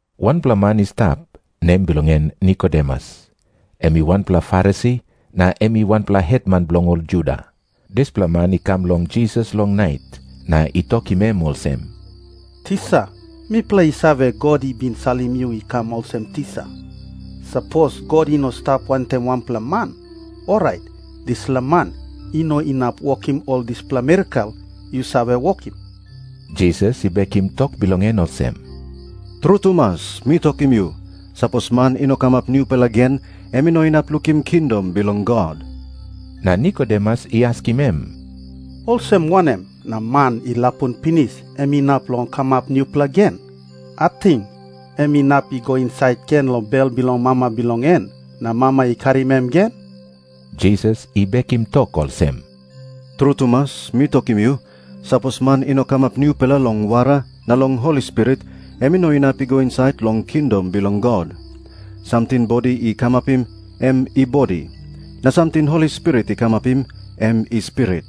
Wanpela man i stap, nem bilong en Nikodemus. Em i wanpela Farisi, na em i wanpela hetman bilong ol Juda. Dispela man i kam long Jisas long nait na i tokim em olsem, “Tisa, mipela i save, God i bin salim yu i kam olsem tisa. Sapos God i no i stap wantaim wanpela man, orait dispela man i no inap wokim ol dispela mirakel yu save wokim.” Jisas i bekim tok bilong en olsem, “Tru tumas mi tokim yu, sapos man i no kamap nupela gen, em i no inap lukim kingdom bilong God.” Na Nikodemus i askim em, “Olsem wanem na man i lapun pinis em inap long kamap nupela gen? Ating em inap i go insait gen long bel bilong mama bilong en na mama i karim em gen?” Jisas i bekim tok olsem, “Tru tumas mi tokim yu, sapos man i no kamap nupela long wara na long Holi Spirit, em i no inap i go insait long kingdom bilong God. Samting bodi i kamapim, em i bodi. Na samting Holi Spirit i kamapim, em i spirit.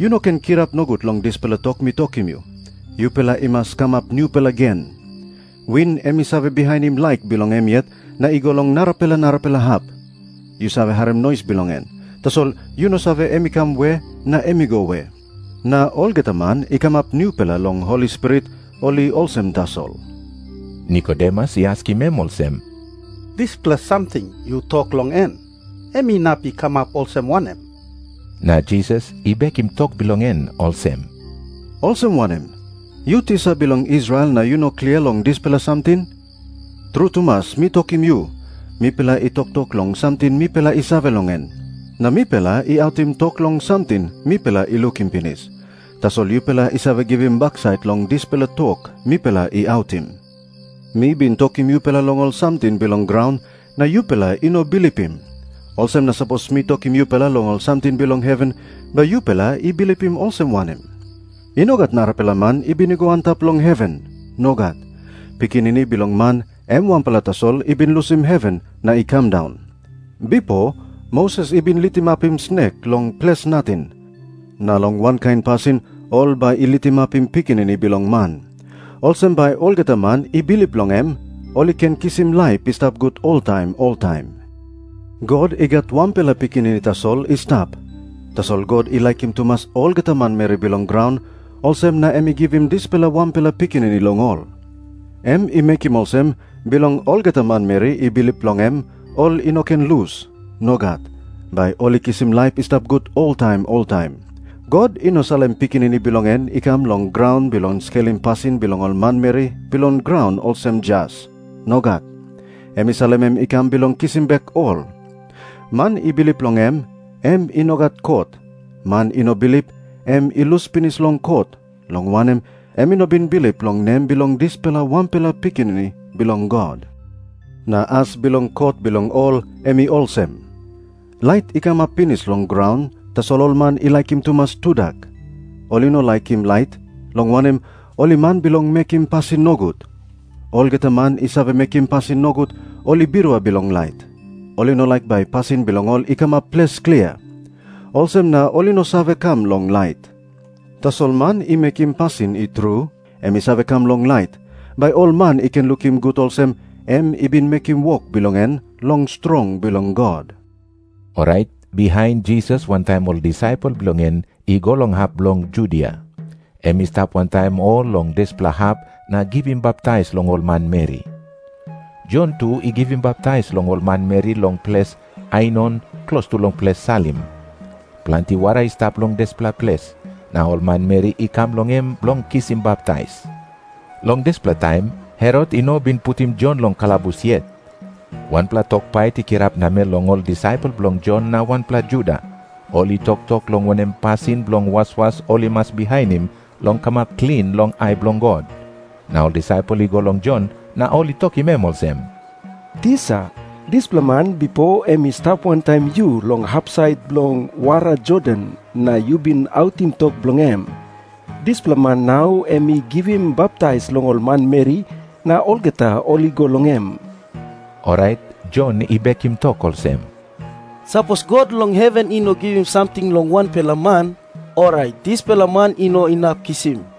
Yu~no ken kirap nogut long dispela tok mi tokim yu, ‘Yupela i mas kamap nupela gen.’ Win em i save bihainim laik bilong em yet na i go long narapela narapela hap. Yu save harim nois bilong en, tasol yu no save em i kam we na em i go we. Na olgeta man i kamap nupela long Holi Spirit, ol i olsem tasol.” Nikodemus i askim em olsem, “Dispela samting yu tok long en, em inap i kamap olsem wanem?” Na Jisas i bekim tok bilong en olsem, “Olsem wanem? Yu tisa bilong Israel na yu no klia long dispela samting? Tru tumas mi tokim yu, mipela i toktok long samting mipela i save long en. Na mipela i autim tok long samting mipela i lukim pinis. Tasol yupela i save givim baksait long dispela tok mipela i autim. Mi bin tokim yupela long ol samting bilong graun, na yupela i no bilipim. Olsem na sapos mi tokim yupela long ol samting bilong heven, bai yupela i bilipim olsem wanem? I no gat narapela man i bin i go antap long heven. Nogat. Pikinini Bilong Man em wanpela tasol i bin lusim heven na i kam daun. Bipo Moses i bin litimapim snek long ples nating, na long wankain pasin ol bai i litimapim Pikinini Bilong Man. Olsem bai olgeta man i bilip long em, ol i ken kisim laip i stap gut oltaim oltaim. “God i gat wanpela Pikinini tasol i stap. Tasol God i laikim tumas olgeta manmeri bilong graun, olsem na em i givim dispela wanpela Pikinini long ol. Em i mekim olsem bilong olgeta manmeri i bilip long em ol i no ken lus. Nogat. Bai ol i kisim laip i stap gut oltaim oltaim. God i no salim Pikinini bilong en i kam long graun bilong skelim pasin bilong ol manmeri bilong graun olsem jas. Nogat. Em i salim em i kam bilong kisim bek ol. Man i bilip long em, em i no gat kot. Man i no bilip, em i lus pinis long kot, long wanem, em i no bin bilip long nem bilong dispela wanpela Pikinini Bilong God. Na as bilong kot bilong ol em i olsem. Lait i kamap pinis long graun, tasol ol man i laikim tumas tudak. Ol i no laikim lait, long wanem, ol i man bilong mekim pasin nogut. Olgeta man i save mekim pasin nogut, ol i birua bilong lait. Ol i no laik bai pasin bilong ol i kamap ples klia. Olsem na ol i no save kam long lait. Tasol man i mekim pasin i tru, em i save kam long lait, bai ol man i ken lukim gut olsem, em i bin mekim wok bilong en long strong bilong God.” Orait bihain Jisas wantaim ol disaipel bilong en i go long hap bilong Judia. Em i stap wantaim ol long dispela hap na i givim baptais long ol manmeri. Jon tu i givim baptais long ol manmeri long ples Ainon klostu long ples Salim. Planti wara i stap long dispela ples, na ol manmeri i kam long em bilong kisim baptais. Long dispela taim Herot i no bin putim Jon long kalabus yet. Wanpela tok pait i kirap namel long ol disaipel bilong Jon na wanpela Juda. Ol i toktok long wanem pasin bilong waswas ol i mas bihainim long kamap klin long ai bilong God. Na ol disaipel i go long Jon, na ol i tokim em olsem, “Tisa, dispela man bipo em i stap wantaim yu long hapsait bilong wara Jordan na yu bin autim tok bilong em, dispela man nau em i givim baptais long ol manmeri, na olgeta ol i go long em.” Orait Jon i bekim tok olsem, “Sapos God long heven i no givim samting long wanpela man, orait dispela man i no inap kisim.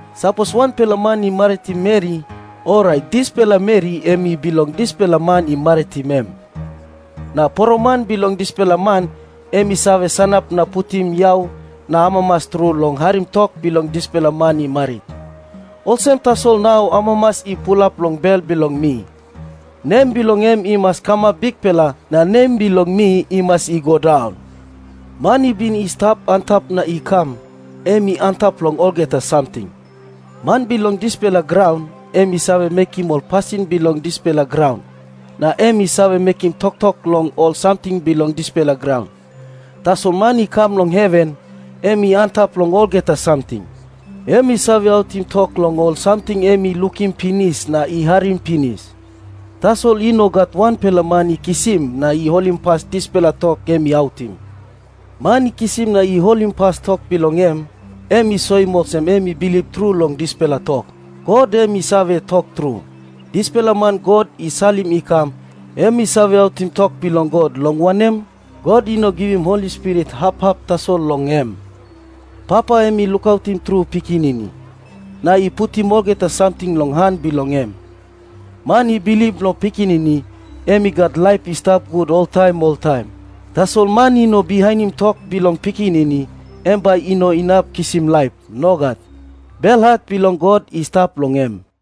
Sapos wanpela man i maritim meri, orait dispela meri em i bilong dispela man i maritim em. Na poroman bilong dispela man em i save sanap na putim yau na amamas tru long harim tok bilong dispela man i marit. Olsem tasol nau amamas i pulap long bel bilong mi. Nem bilong em i mas kamap bikpela, na nem bilong mi i mas i go daun.” Man i bin i stap antap na i kam, em i antap long olgeta samting. Man bilong dispela graun, em i save mekim ol pasin bilong dispela graun, na em i save mekim toktok long ol samting bilong dispela graun. Tasol man i kam long heven, em i antap long olgeta samting. Em i save autim tok long ol samting em i lukim pinis na i harim pinis. Tasol i no gat wanpela man i kisim na i holimpas dispela tok em i autim. Man i kisim na i holimpas tok bilong em, em i soim olsem em i bilip tru long dispela tok, “God em i save tok tru.” Dispela man God i salim i kam, em i save autim tok bilong God, long wanem, God i no givim Holi Spirit hap hap tasol long em. Papa em i laikim tru Pikinini, na i putim olgeta samting long han bilong em. Man i bilip long Pikinini, em i gat laip i stap gut oltaim oltaim. Tasol man i no bihainim tok bilong Pikinini, em bai i no inap kisim laip. Nogat. Belhat bilong God i stap long em.